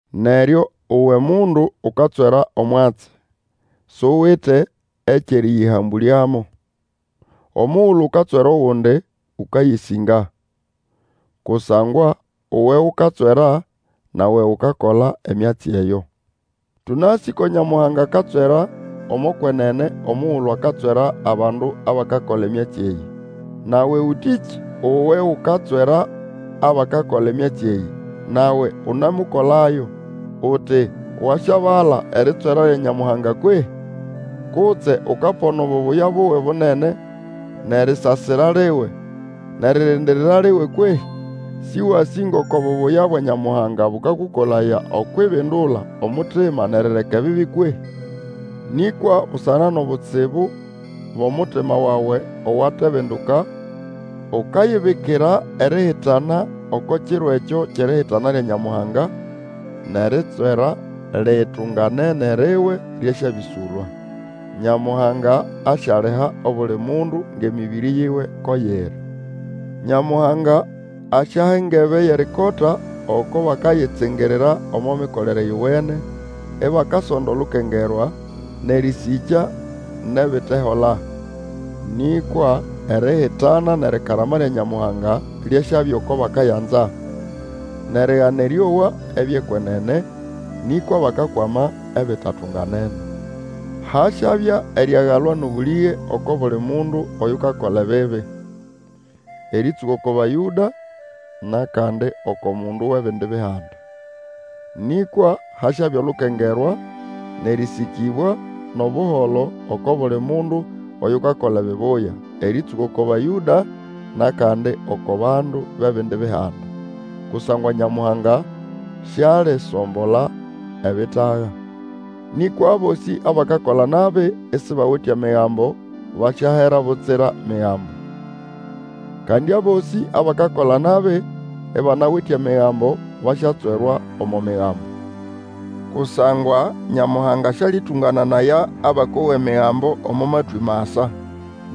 Neryo uwe mundu ukatswera omwatsi, suwite ekyʼerĩyĩhambũlyamo. Omugulu ukatswera ogundi, ũkayĩsĩnga. Kusangwa uwe ukatswera, nawe ukakola emyatsi eyo. Tũnasĩ ko Nyamuhanga akatswera omo kwenene omugulu akatswera abandu abakakola emyatsi eyĩ. Nawe ũtĩkĩ? Uwe ukatswera abakakola emyatsi eyĩ, nawe unemukolayo! Uti wasyabala eritswera lya Nyamuhanga kwehĩ? Kutse ukapona obubuya buwe bunene, nʼerisasira liwe, nʼeririndirira liwe kwehĩ? Sĩwasĩ ngoko bubuya bwa Nyamuhanga bũkakũkolaya okwʼibindula omutima nʼerireka ebibi kwehĩ? Nĩkwa busana nʼobutsibu bʼomutima wawe owatebinduka, ukayibikira erihitana oko kiro ekyo kyʼerihitana lya Nyamuhanga nʼeritswera litunganene riwe lyasyabĩsũlwa. Nyamuhanga asyaliha obuli mundu ngʼemĩbĩrĩ yiwe ko yiri. Nyamuhanga asyaha engebe yʼerikota oko bakayitsingirira omo mikolere yowene, ibakasonda olukengerwa, nʼerĩsĩkya nʼebitehola. Nĩkwa erihitana nʼerikarama lya Nyamuhanga lyasyabya oko bakayanza, nʼerigana erĩowa ebyʼekwenene, nĩkwa bakakwama ebitatunganene. Hasyabya eriagalwa nʼobũlĩge oko buli mundu oyukakola ebibi, erĩtsũka oko Bayũda, nʼakandi oko mundu wʼebindi Bihanda. Nĩkwa hasyabya olukengerwa, nʼerĩsĩkĩbwa, nʼobuholo oko buli mundu oyukakola ebibuya, erĩtsũka oko Bayũda, nʼakandi oko bandu bʼebindi Bihanda. Kusangwa Nyamuhanga sialisombola ebitaga. Nĩkwa abosĩ abakakola nabi, isibawite Emigambo, basyahera butsira Migambo. Kandi abosĩ abakakola nabi, ibanawite Emigambo, basyatswerwa omo Migambo. Kusangwa Nyamuhanga Sĩalĩtũngananaya abakowa Emigambo omo matwĩ masa.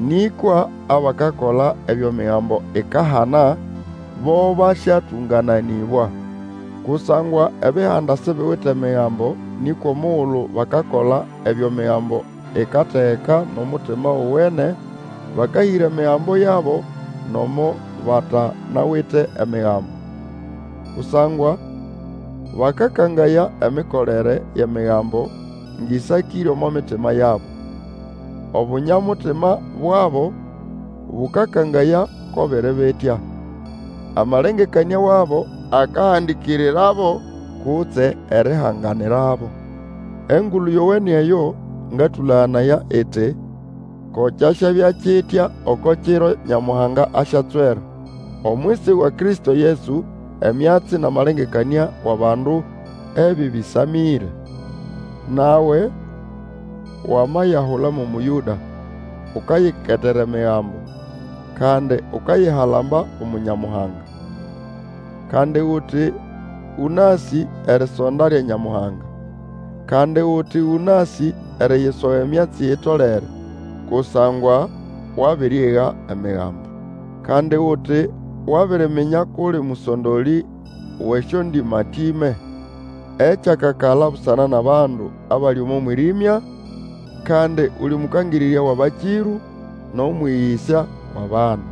Nĩkwa abakakola ebyo Migambo ikahana, bo basyatũngananĩbwa. Kusangwa Ebihanda sibiwite Migambo nĩkwa omugulu bakakola ebyo Migambo ikategeka nʼomutima owene, bakahĩra emigambo yabo, nomo batanawite Emigambo. Kusangwa bakakangaya emikolere yʼEmigambo ngʼĩsakĩre omo mitima yabo. Obunya-mutima bwabo bũkakangaya ko biri bitya. Amalengekanĩa wabo akahandikirirabo kutse erihanganirabo. Engulu Yowene eyo ngatũlaganaya iti, Ko kyasyabya kitya oko kiro Nyamuhanga asyatswera, omwisi wa Kristo Yesu, emyatsi nʼamalengekanĩa wʼabandu ebĩbĩsamĩre. Nawe, wamayahula mo Mũyũda, ukayiketera Emigambo, kandi ukayihalamba umu Nyamuhanga. Kandi uti ũnasĩ erisonda lya Nyamuhanga, kandi uti ũnasĩ eriyisoga emyatsi itolere, kusangwa wabiriyga Emigambo. Kandi uti wabiriminya kʼuli mũsondolĩ wʼesyondĩmatĩme, ekyakakala busana nʼabandu abali omo mwĩrĩmya, kandi uli mũkangĩrĩrya wʼabakĩrũ, nʼomwĩgĩsya wʼabana.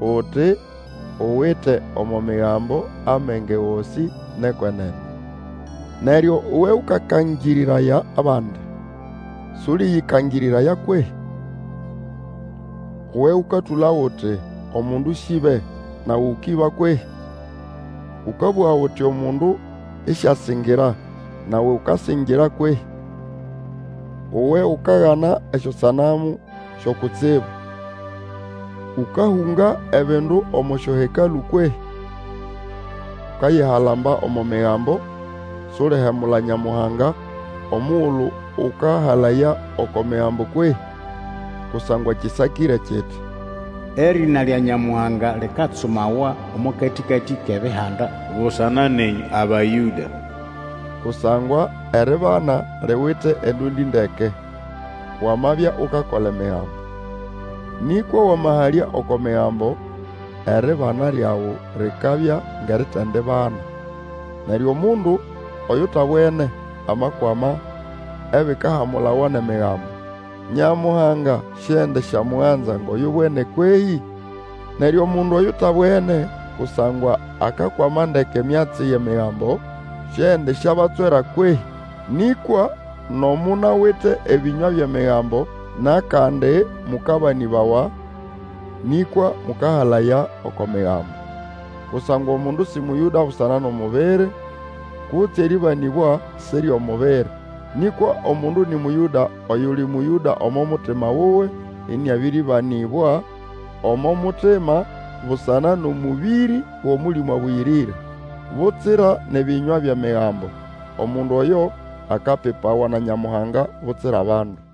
Uti uwite omo Migambo amenge gosĩ nʼekwenene. Neryo uwe ũkakangĩrĩraya abandi, sũlĩyĩkangĩrĩraya kwehĩ? Uwe ũkatũlago uti, omundu syĩbe, nawe ũkĩba kwehĩ? Ũkabũga uti omundu ĩsyasĩngĩra, nawe ũkasĩngĩra kwehĩ? Uwe ukagana esyosanamu syo kutsibu, ũkahũnga ebindu omo syohekalũ kwehĩ? Ukayihalamba omo Migambo, sulihemula Nyamuhanga omugulu ũkahalaya oko Migambo kwehĩ? Kusangwa kĩsakĩre kiti, Erĩna lya Nyamuhanga likatsumawa omo katĩkatĩ kʼEbihanda, busana nenyũ Abayũda. Kusangwa eribana liwite endũndĩ ndeke, wamabya ukakola Emigambo. Nĩkwa wamahalya oko Migambo, eribana lyawe likabya ngʼeritendibana. Neryo omundu oyutabwene amakwama ebikahamulawa nʼEmigambo, Nyamuhanga siendisyamuganza ngʼoyubwene kwehĩ? Neryo omundu oyutabwene, kusangwa akakwama ndeke emyatsi yʼEmigambo, siendisyabatswera kwehĩ? nĩkwa, nomo munawite ebĩnywa byʼEmigambo nʼakandi mũkabanĩbawa, nĩkwa mũkahalaya oko Migambo. Kusangwa omundu sĩ Mũyũda busana nʼomubiri, kutse erĩbanĩbwa si ryʼomubiri. Nĩkwa omundu nĩ Mũyũda oyuli Mũyũda omo mutima wuwe, ĩnĩabĩrĩbanĩbwa omo mutima busana nʼomũbĩrĩ wʼOmũlĩmũ Abũyĩrĩre, butsira nʼebĩnywa byʼEmigambo. Omundu oyo akapipawa na Nyamuhanga, butsira bandu.